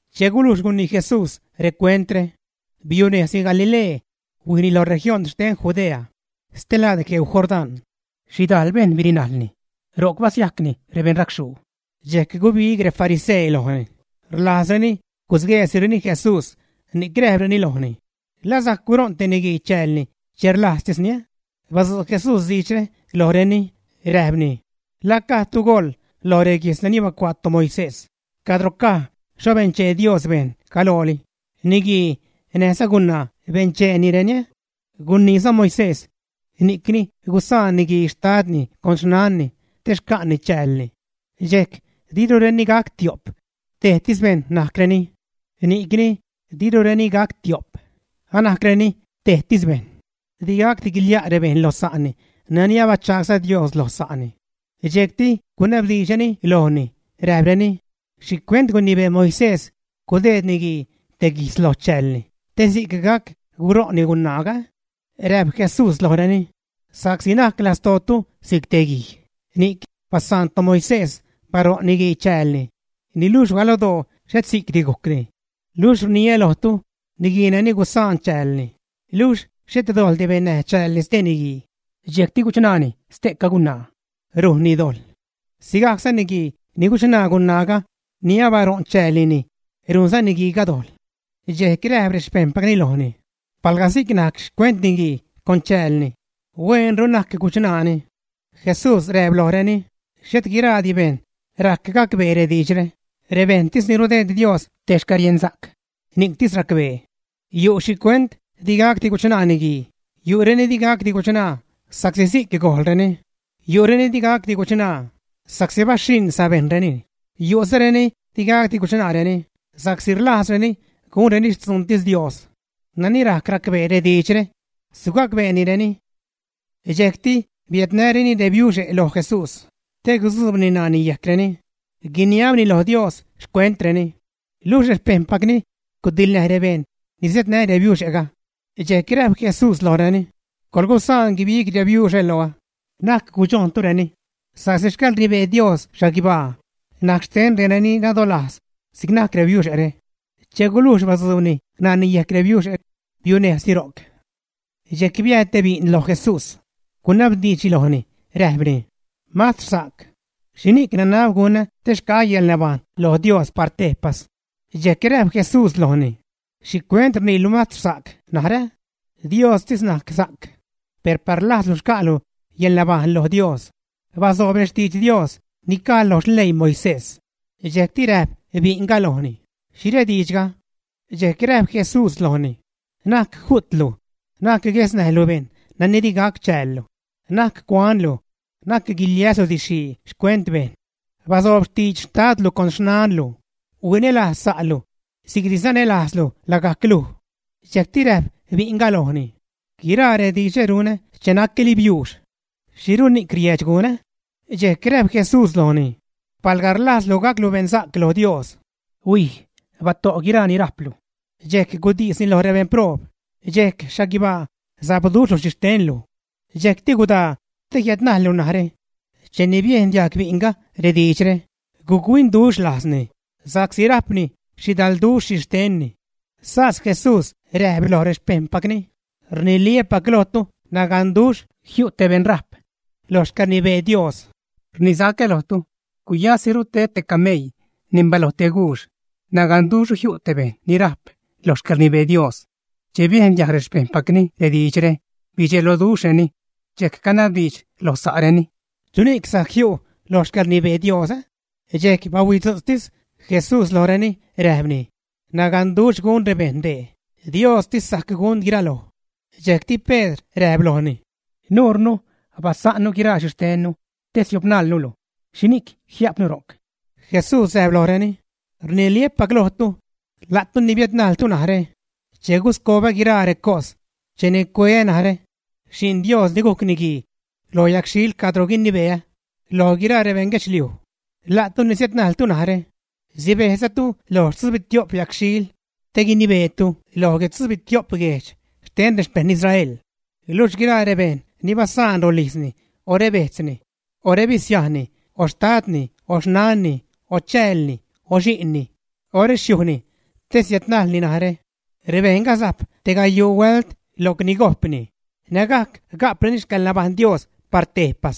Che gulujx gunii Jesús recuentre, biunejzni Galilee, huijni lo región xten Judea, stelaad gueu Jordán. Xhidajl bejṉ birinajlni, ro'c basiajcni rebeṉracxhuu, dxejc gubig refarisee lojni, rlajzreni gusgueesireni Jesús ni'c räjpreni lojni: ―¿La sajc guṟo'n te niguii chäälni che rlajztisni, ä? Badzu' Jesús diidxre lojreni, räjpni: ―¿La gajdtu goḻ lo reguijtz nani bacuaa toMoisés cadro caj xho benchee Dios bejṉ galooli: “Niguii näjza gunaa bencheenireni”? Guniiza Moisés: “Ni'cni gusaan niguii xtadni con xnanni te xca'ni chäälni, dxejc dirureni gac tio'p, tejtis bejṉ najcreni.” Ni'cni dirureni gac tio'p, anajcreni tejtis bejṉ, digacdi guilia' rebejṉ lo sa'ni nani abachagsa' Dios lo sa'ni. Dxejcti gunabdiidxreni lojni, räjpreni: ―¿Xhicuent gunibee Moisés gudeed niguii te guijtz lo chäälni te si'c gac guṟo'nni gunaaga, ä? Räjp Jesús lojreni: ―Sa'csi najc lastootu si'c te guij, ni'c basaan toMoisés baṟo'n niguii chäälni, niluxh galodoo et si'cti gujcni. Luxh rniä lojtu, niguii nani gusaan chäälni, luxh xhet dojḻdi bennäj chäälni stee niguii, dxejcti guchṉaani ste'ca gunaa, rujnni dojḻ. Sigajcza niguii ni guchṉaa gunaaga ni abaṟo'n chäälnini, rujnza niguiiga dojḻ. Dxejc räjp rexpejṉpacni lojni: ―Palga si'c najc xcuent niguii con chäälni, hueenru na'c guchṉaani. Jesús räjp lojreni: ―Xhet guiraadi bejṉ rajc gacbee rediidxre, rebejṉtis ni rudeed Dios te xcäriensa'c ni'ctis racbee. Yu' xhicuent digacdi guchṉaa niguii: yu'reni digacdi guchṉaa sa'csi si'c gojḻreni; yu'reni digacdi guchṉaa sa'csi baxhiṉ sabejṉreni; yu'zareni digacdi guchṉaareni sa'csi rlajzreni gunreni xtzuuntis Dios. Nani rajc racbeeni rediidxre, sugacbeenireni. Dxejcti biädnäreni rebiuxe' loj Jesús te gudzuubni ṉaani yejcreni, guiniabni lo Dios xcuentreni. Luxh rexpejṉpacni gudiḻnäj rebejṉ ni siädnä rebiuxe'ga. Dxejc räjp Jesús lojreni: ―Coḻgusaan guibig rebiuxe' loä, na'c gudxojntureni, sa'csi xcäḻrnibee Dios xhaguibaa najc xten reni nadolajz si'c najc rebiuxe're. Che gulujx badzuubni ṉaani yejc rebiuxe', biunejzni ro'c. Dxejc biääd te bi'n lo Jesús, gunabdiidxni lojni; räjpni: ―Mastr sa'c, ¿xhini'c nanab gunä te xca'ä yäḻnabajṉ lo Dios par tejpas? Dxejc räjp Jesús lojni: ―¿Xhicuent rniilu mastr sa'c narä? Diostis najc sa'c. Per par rlajzlu xca'lu yäḻnabajṉ lo Dios, bazoob rextidx Dios ni caj lo xleii Moisés. Dxejcti räjp bi'nga lojni: ―¿Xhi rediidxga? Dxejc räjp Jesús lojni: ―Na'c ju'tlu, na'c guesnäjlu bejṉ nani di gac chäällu, na'c cuanlu, na'c guiliäslu didxxhii xcuent bejṉ. Bazoob xtidx xtadlu con xnanlu, huinälajz sa'lu si'cni sanälajzlu lagajc luj. Dxejcti räjp bi'nga lojni: ―Guiraa rediidxre runä che nacä́li biuux. ¿Xhiruxni'c riäädx gunä? Dxejc räjp Jesús lojni: ―Palga rlajzlu gaclu beṉsa'c lo Dios, huij, bato' guiraa ni rajplu, dxejc gudisni lo rebeṉproob, dxejc xhaguibaa sapduxhlu xhixtenlu. Dxejcti gudaa te jiädnajllu narä. Cheni biejn diajg bi'nga rediidxre, guc-huinduxh lajzni sa'csi rajpni xhidalduxh xhixtenni. Sas Jesús räjp loj rexpejṉpacni: ―Rniliä́pac lojtu, naganduxh jiu' te beṉ rajp loj xcäḻrnibee Dios. Rnisacä lojtu, guyasiru ted te cameii neṉ baloj te guux; naganduxhru jiu' te bejṉ ni rajp lo xcäḻrnibee Dios. Che biejn diajg rexpejṉpacni rediidxre, bidxeloduxhreni, dxejc canabdiidx loj sa'reni: ―¿Chuni'c sajc jiu' lo xcäḻrnibee Dios? Dxejc bahuidzu'tz Jesús lojreni, räjpni: ―Naganduxh gun rebejṉ dee, Diostis sajc gun guiraloj. Dxejcti Pedr räjp lojni: ―Nuurnu basa'nnu guiraa xhixtennu te siopnalnulu. ¿Xhini'c jia'pnu ro'c? Jesús räjp lojreni: ―Rniliä́pac lojtu, la'tu ni biädnajltu narä, che guscobä guiraa recos cheni cueä narä, Xi'n Dios ni gujc Niguii, lo yagxhil cadro guinibeä lo guiraa rebeṉ guedxliuj, la'tu ni siädnajltu narä sibejzatu lo tzubitio'p yagxhil te guinibeetu loj guitzubitio'p guejdx xten rexpejṉ Israel. Luxh guiraa rebejṉ ni basa'n rolijzni o rebejtzni, o rebisiajnni, o xtadni, o xnanni, o chäälni, o xi'nni, o rexhujni, te siädnajlni narä, rebejṉga sajp te gayuu huält locni gojpni, nägajc ga'preni xcäḻnabajṉ Dios par tejpas.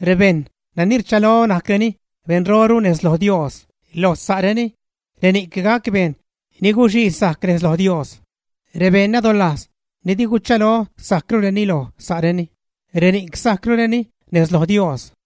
Rebejṉ nani rchalo najcreni beṉroru lo sa'reni nez loj Dios, reni'c gac bejṉ ni guxii sajc nez loj Dios. Rebejṉ nadolajz ni di guchalo sajcrureni lo sa'reni, reni'c sajcrureni nez loj Dios.